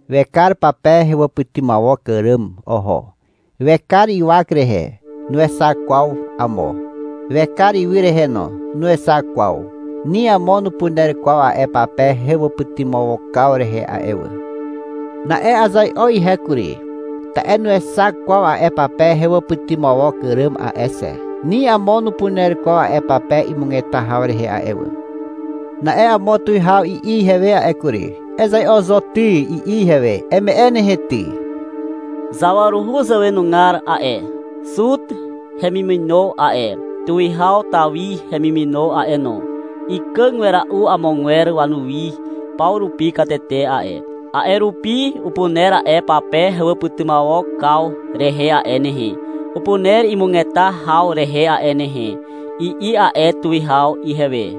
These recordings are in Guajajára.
Wekar pape hewàpytymawok àràm oho. Wekar ywak rehe. Nuexak kwaw amo. Wekar ywy rehe no. Nuexak kwaw. Ni amo nupuner kwaw a'e pape hewàpytymawokaw rehe a'e wà. Na'e azai'o ihe kury, ta'e nuexak kwaw a'e pape hewàpytymawok àràm a'e xe. Ni amo nupuner kwaw a'e pape imugeta haw rehe a'e wà. Na'e amo tuwihaw i'i ihewe a'e kury. — Ezai'o zo ty, i'i ihewe. — Eme'e nehe ty. Zawaruhu zàwenugar a'e, Zuta hemimino a'e, Tuwihaw Tawi hemimino a'e no, ikàg wera'u amogwer wanuwi paw rupi katete a'e. A'e rupi upuner a'e pape hewàpytymawokaw rehe a'e nehe, upuner imugeta haw rehe a'e nehe, i'i a'e tuwihaw ihewe.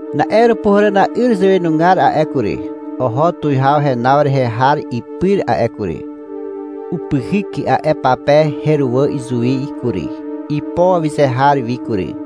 Na'e Àràpuhàràna'yr zàwenugar a'e kury, oho tuwihaw henaw rehe har ipyr a'e kury. Upyhyk a'e pape heruwà izuwi kury, ipo awyze har wi kury.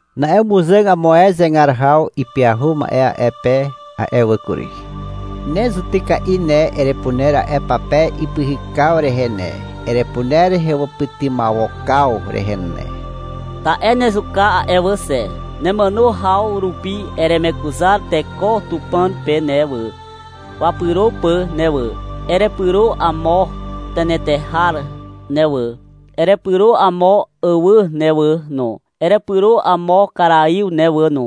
Na'e umuzàg amo ae zegar haw ipyahu ma'e a'e pe a'e wà kury. Ne zutyka'i ne, Erepuner a'e pape ipyhykaw rehe ne, Erepuner hewàpytymawokaw rehe ne. Ta'e nezuka a'e wà xe. Nemàno haw rupi eremekuzar teko Tupàn pe ne wà, wapyro pà ne wà. Erepyro amo tenetehar ne wà. Erepyro amo àwà ne wà no, Erepyro amo karaiw ne wà no.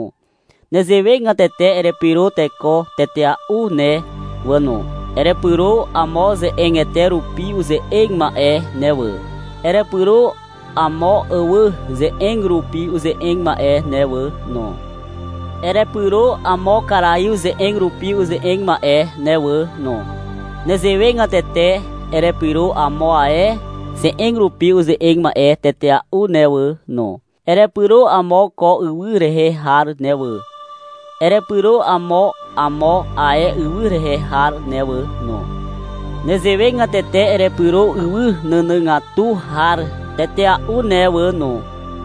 Nezewegatete erepyro teko tetea'u ne wà no. Erepyro amo ze'egete rupi uze'eg ma'e ne wà. Erepyro amo àwà ze'eg rupi uze'eg ma'e ne wà no. Erepyro amo karaiw ze'eg rupi uze'eg ma'e ne wà no. Nezewegatete erepyro amo ae ze'eg rupi uze'eg ma'e tetea'u ne wà no. — Erepyro amo ko ywy rehe har ne wà. Erepyro amo amo ae ywy rehe har ne wà no. Nezewegatete erepyro ywy nànàgatu har tetea'u ne wà no.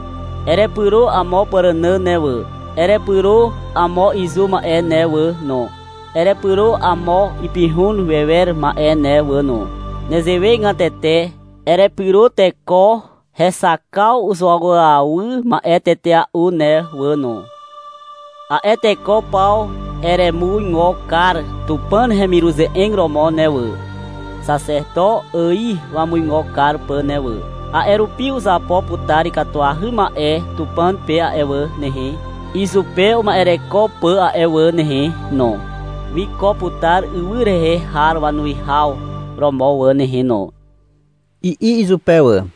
— Erepyro amo pàrànà ne wà. Erepyro amo izu ma'e ne wà no, Erepyro amo ipihun wewer ma'e ne wà no. Nezewegatete erepyro teko hexakaw uzuawyawy ma'e tetea'u ne wà no. A'e teko paw eremuigo kar Tupàn hemiruze'eg romo ne wà, Xaxeto ài wamuigo kar pà ne wà. A'e rupi uzapo putar ikatuahy ma'e Tupàn pe a'e wà nehe, Izupe uma'ereko pà a'e wà nehe no. Wiko putar ywy rehe har wanuwihaw romo wà nehe no, i'i izupe wà.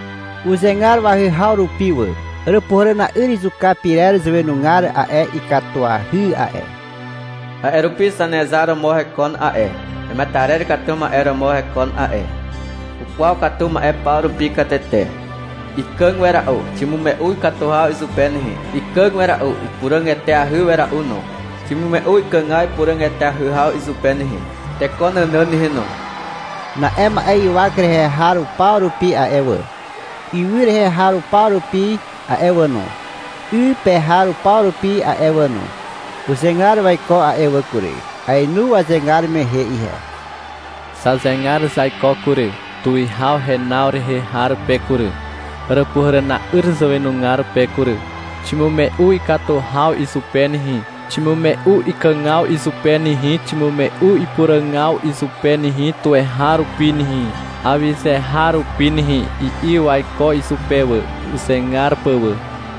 Uzegar wahyhaw rupi wà. Àràpuhàràna'yr izuka pyrer zàwenugar a'e, Ikatuahy a'e. A'e rupi Zanezar romo hekon a'e. Hemetarer katu ma'e romo hekon a'e. Ukwaw katu ma'e paw rupi katete. Ikàg wera'u. Ximume'u ikatu haw izupe nehe. Ikàg wera'u, ipuràg eteahy wera'u no. Ximume'u ikàgaw ipuràg eteahy haw izupe nehe, teko nànàn nehe no. Na'e ma'e ywak rehe har paw rupi a'e wà, ywy rehe har paw rupi a'e wà no, 'y pe har paw rupi a'e wà no, uzegar waiko a'e wà kury. Aenu wazegar mehe ihe. Zazegar zaiko kury, Tuwihaw henaw rehe har pe kury, Àràpuhàràna'yr zàwenugar pe kury. Ximume'u ikatu haw izupe nehe Ximume'u ikàgaw izupe nehe Ximume'u ipuràgaw izupe nehe Tuweharupi nehe, Awyze har rupi nehe, i'i waiko izupe wà, uzegar pà wà.